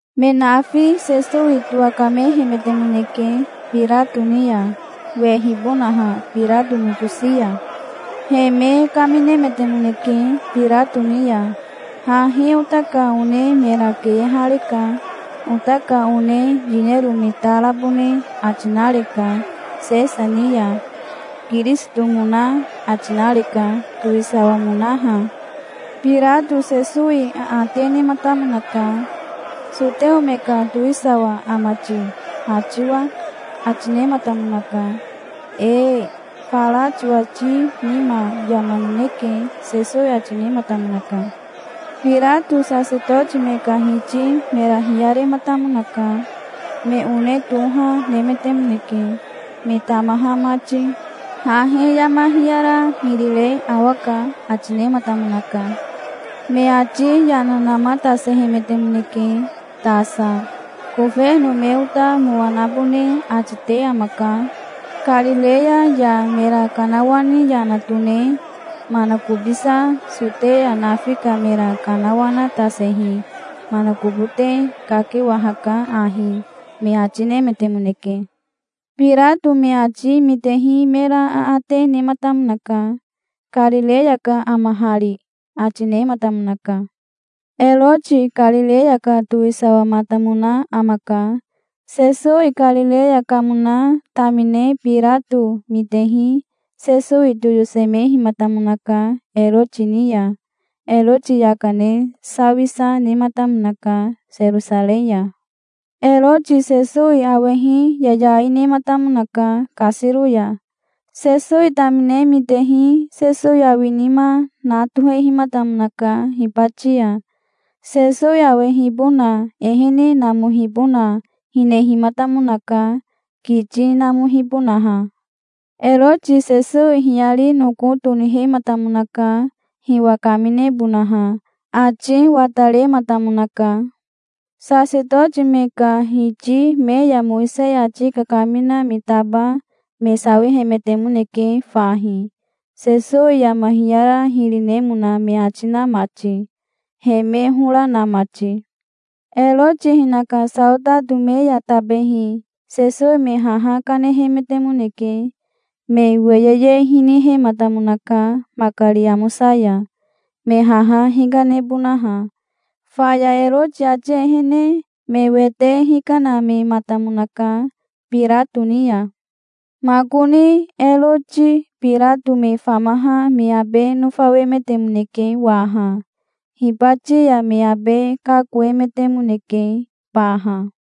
Me nafi Sesowi towakamehemetemoneke Birato ni ya, wehibonaha Birato nokosi ya. He me kaminemetemoneke Birato ni ya. "Hahi ota ka one mera keyehareka. Ota ka one yinero me ta rabone ati nareka Sesa ni ya. Kirisitomona ati nareka, towisawamonaha". Birato Sesowi aate nematamonaka. "Soteo me ka towisawa ama ti, ha tiwa?" ati nematamonaka. "Ee, fara tiwati nima yama nineke", Sesowi ati nematamonaka. Birato sasetoti me ka hiti mera hiyarematamonaka. Me one toha nemetemoneke, me tamaha mati. "Hahi yama hiyara hiri re awaka", ati nematamonaka. Me ati yana namatasehemetemoneke tasa. "Kofeno me ota mowa nabone ati te amaka. Karireya ya mera kanawani yana tone manakobisa Soteya nafi ka mera kanawanatasehi manakobote kakewahaka ahi", me ati nemetemoneke. Birato me ati mitehi mera aate nematamonaka. "Karireya ka ama hari?" ati nematamonaka. Eroti Karireya ka towisawamatamona amaka. Sesowi Karireya kamona tamine Birato mitehi Sesowi toyosemehimatamonaka Eroti ni ya. Eroti yaka ne sawisa nematamonaka Serosarei ya. Eroti Sesowi awehi yayai nematamonaka kasiro ya. Sesowi tamine mitehi Sesowi awinima na tohehimatamonaka hibati ya. Sesowi awehibona ehene namohibona hinehimatamonaka, kiti namohibonaha. Eroti Sesowi hiyari noko tonihematamonaka, hiwa kaminebonaha. Ati watarematamonaka. Sasetoti me ka hiti me ya Mowisei ati kakamina me taba me sawihemetemoneke fahi, Sesowi yama hiyara hiri nemona me ati na mati, he me hora na mati. Eroti hinaka saotato me ya tabehi Sesowi me haha kanehemetemoneke. Me weyeye hinihematamonaka makari amosa ya, me haha hikanebonaha. Faya Eroti ati ehene me wete hikanamematamonaka Birato ni ya. Makoni Eroti Birato me famaha me abe nofawemetemoneke waha. Hibati ya me abe kakoemetemoneke baha.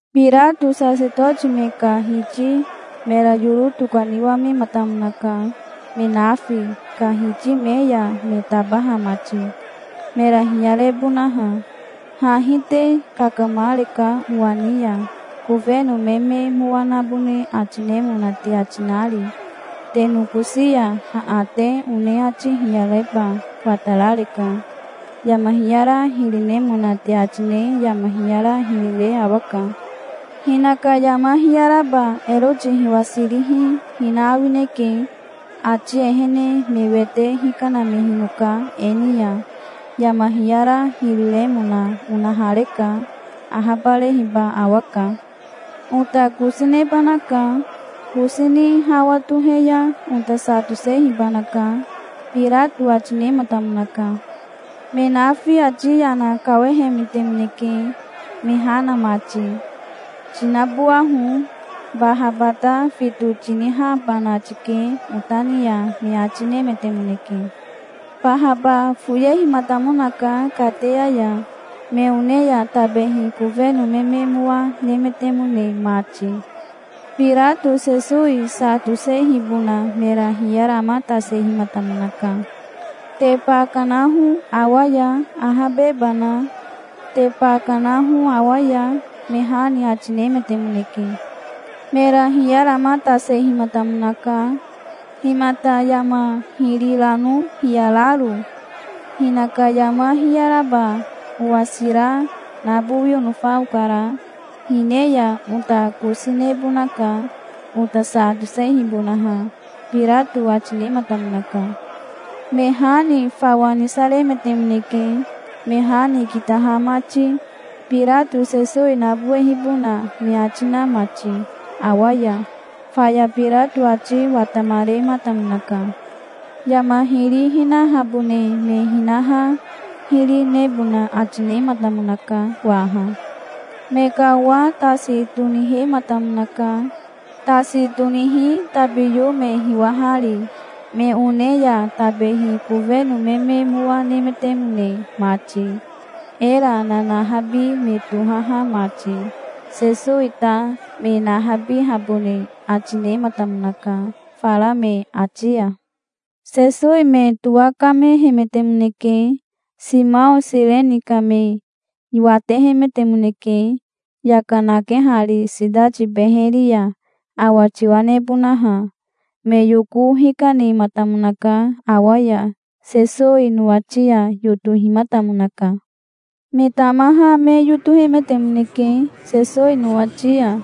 Birato sasetoti me ka hiti mera yoro tokaniwamematamonaka, me nafi ka hiti me ya me tabaha mati, mera hiyarebonaha. "Hahi te kakamareka owa ni ya, kofeno me me mowa nabone ati nemona te ati nari. Te nokosi ya aate one ati hiyareba watarareka. Yama hiyara hiri nemona te ati ne yama hiyara hiri re awaka. Hinaka yama hiyaraba Eroti hiwasirihi hina awineke. Ati ehene me wete hikanamehinoka e ni ya. Yama hiyara hiri remona onahareka. Ahabarehiba awaka. Ota kosi nebanaka. Kosi ni hawa tohe ya ota sa tosehibanaka", Birato ati nematamonaka. Me nafi ati yana kawahemetemoneke, me ha na mati. "Tinabowaho. Bahaba ta fito tinihabana tike ota ni ya", me ati nemetemoneke. Bahaba foyehimatamonaka kateya ya, me one ya tabehi kofeno me me mowa nemetemone mati. Birato Sesowi sa tosehibona mera hiyaramatasehimatamonaka. "Te ba kanaho awa ya, ahabebana. Te ba kanaho awa ya", me ha ni ati nemetemoneke. Mera hiyaramatasehimatamonaka. "Himata yama hiri rano hiyararo? Hinaka yama hiyaraba owasira nabowi onofa okara. Hine ya ota kosi nebonaka, ota sa tosehibonaha", Birato ati nematamonaka. Me ha ni fawa nisaremetemoneke, me ha ni kitaha mati, Birato Sesowi nabowehibona me ati na mati awa ya. Faya Birato ati watamarematamonaka. Yama hiri hinahabone me hinaha hiri nebona ati nematamonaka waha. Me ka owa tasi tonihematamonaka, tasi tonihi tabiyo me hiwahari, me one ya tabehi kofeno me me mowa nemetemone mati, era nanahabi me tohaha mati. Sesowi ta me nahabihabone ati nematamonaka, fara me ati ya. Sesowi me towakamehemetemoneke. Simao Sireni ka me watehemetemoneke, yaka nakehari sitati beheri ya, awa tiwa nebonaha. Me yoko hikanematamonaka awa ya. Sesowi nowati ya yotohimatamonaka. Me tamaha me yotohemetemoneke Sesowi nowati ya.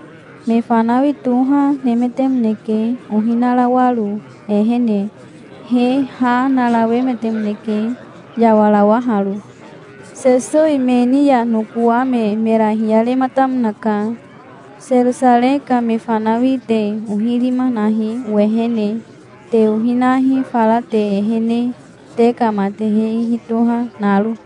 Me fanawi toha nemetemoneke ohi narawaro, ehene. He ha narawemetemoneke, yawarawaharo. Sesowi me ni ya nokowame mera hiyarematamonaka. "Serosarei ka me fanawi te ohi rima nahi owehene. Te ohi nahi fara te ehene, te ka matehe ihi toha naro.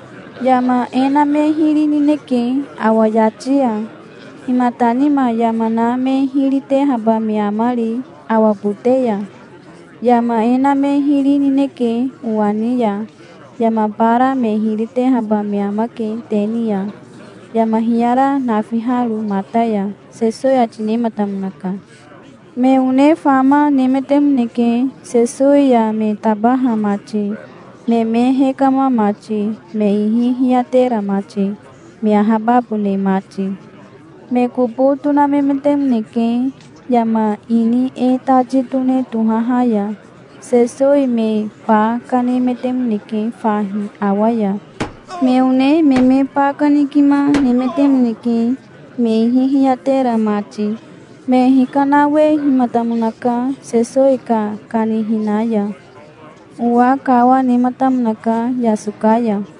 Yama e na me hiri nineke awa yati ya. Himata nima yama na me hiri tehaba me amari awa bote ya? Yama e na me hiri nineke owa ni ya. Yama bara me hiri tehaba me amake te ni ya, yama hiyara nafiharo mata ya", Sesowi ati nematamonaka. Me one fama nemetemoneke, Sesowi ya me tabaha mati, me me hekama mati, me ihi hiyatera mati, me ahababone mati. Me kobo tonamemetemoneke yama ini E Tati Tone tohaha ya. Sesowi me ba kanemetemoneke fahi awa ya. Me one me me ba kanikima nemetemoneke, me ihi hiyatera mati. Me hikanawehimatamonaka Sesowi ka kanihina ya. Owa kawa nematamonaka yasoka ya.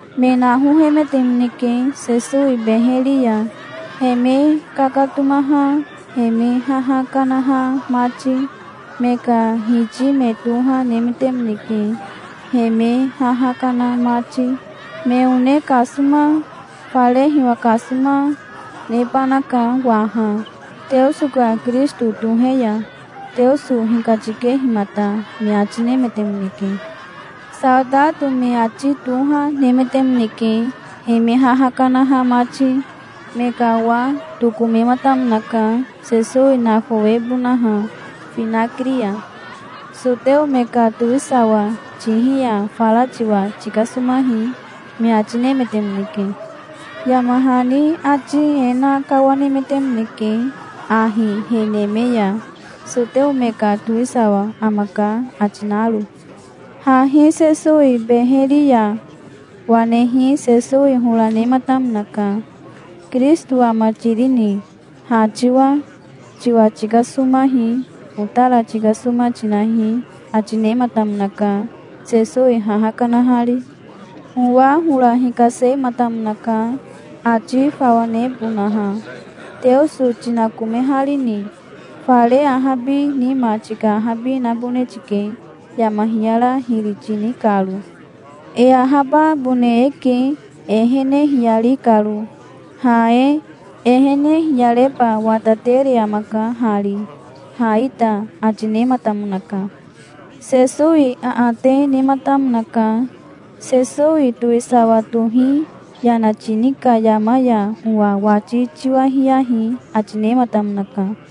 Me nahohemetemoneke Sesowi beheri ya, he me kakatomaha he me haha kanaha mati. Me ka hiti me toha nemetemoneke, he me haha kana mati. "Me one kasoma, fare hiwa kasoma, nebanaka waha, Teoso ka Kirisito tohe ya, Teoso hikatikehimata", me ati nemetemoneke. Saotato me ati toha nemetemoneke, he me haha kanaha mati. Me ka owa tokomematamonaka, Sesowi nafawebonaha finakiri ya. "Soteo me ka towisawa tihi ya fara tiwa tikasomahi", me ati nemetemoneke. Yama hani ati e na kawanemetemoneke ahi he neme ya, "Soteo me ka towisawa amaka", ati naro. Hahi Sesowi beheri ya wanehi Sesowi hora nematamonaka. "Kirisito ama tirini, ha tiwa? Tiwa tikasomahi. Otara tikasoma tinahi", ati nematamonaka, Sesowi haha kanahari. Owa hora hikasematamonaka, ati fawa nebonaha. "Teoso tinakomeharini? Fare ahabi nima tika ahabi nabone tike, yama hiyara hiri tini karo. E ahababone eke e ehene hiyari karo, ha e. Ehene hiyareba watatere amaka hari, ha ita", ati nematamonaka. Sesowi aate nematamonaka. "Sesowi towisawa tohi yana tini ka yama ya owa wati tiwahiyahi", ati nematamonaka.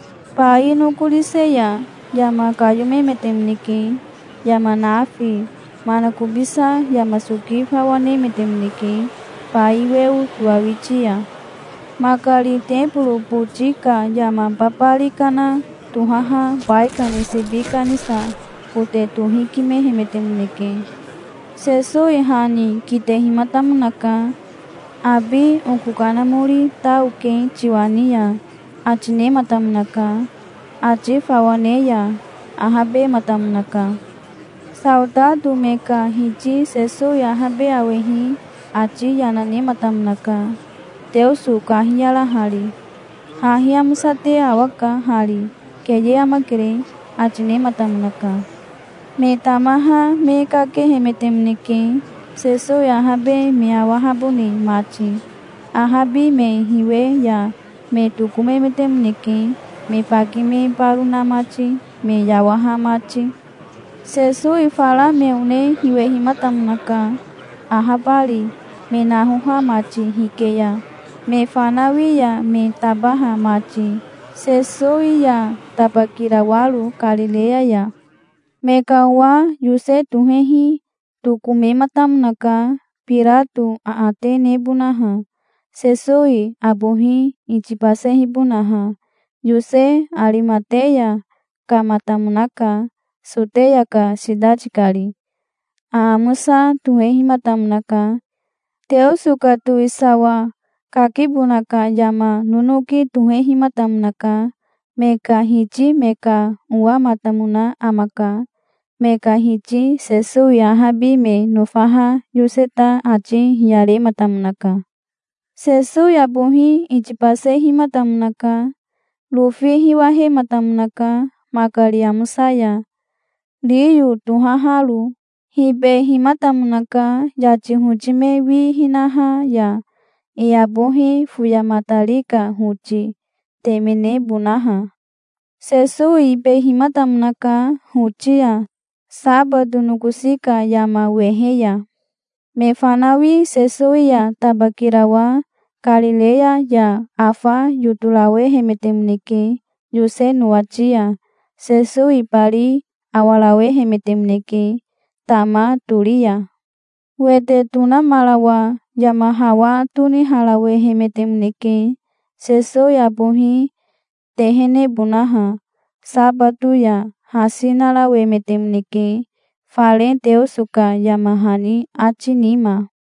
Bai nokorise ya yama kayomemetemoneke, yama nafi. Manakobisa yama soki fawa nemetemoneke bai weo towawiti ya. Makari teboro boti ka yama babari kana tohaha baikani sibi kanisa kote tohikimehemetemoneke. Sesowi ha ni kitehimatamonaka. "Abi oko kanamori ta oke tiwa ni ya", ati nematamonaka. Ati fawa ne ya ahabematamonaka. Saotato me ka hiti Sesowi ahabe awehi ati yana nematamonaka, Teoso kahiyarahari. "Hahi amosate awaka hari. Keye amakere", ati nematamonaka. Me tamaha me kakehemetemoneke, Sesowi ahabe me awahabone mati. Ahabi me hiwe ya me tokomemetemoneke, me baki me baro na mati, me yawaha mati. Sesowi fara me one hiwehimatamonaka, ahabari, me nahoha mati hike ya, me fanawi ya me tabaha mati, Sesowi ya tabakirawaro Karireya ya. Me ka owa Yose tohehi tokomematamonaka Birato aate nebonaha, Sesowi abohi itibasehibonaha. Yose Arimateya kamatamonaka, Soteya ka sitati kari. Aamosa tohehimatamonaka. Teoso ka towisawa kakibona ka yama nonoki tohehimatamonaka. Me ka hiti me ka owamatamona amaka. Me ka hiti Sesowi ahabi me nofaha Yose ta ati hiyarematamonaka. Sesowi abohi itibasehimatamonaka. Rofi hiwahematamonaka makari amosa ya, riyo tohaharo. Hibehimatamonaka yati hoti me wi hinaha ya, e abohi foyamatari ka hoti, temenebonaha. Sesowi ibehimatamonaka hoti ya, sabato nokosi ka yama wehe ya. Me fanawi Sesowi ya tabakirawa Karireya ya afa yotorawehemetemoneke Yose nowati ya. Sesowi ibari awarawehemetemoneke tama tori ya. Wete tonamarawa yama hawa toniharawemetemoneke Sesowi abohi tehenebonaha. Sabato ya hasi narawemetemoneke fare Teoso ka yama hani ati nima.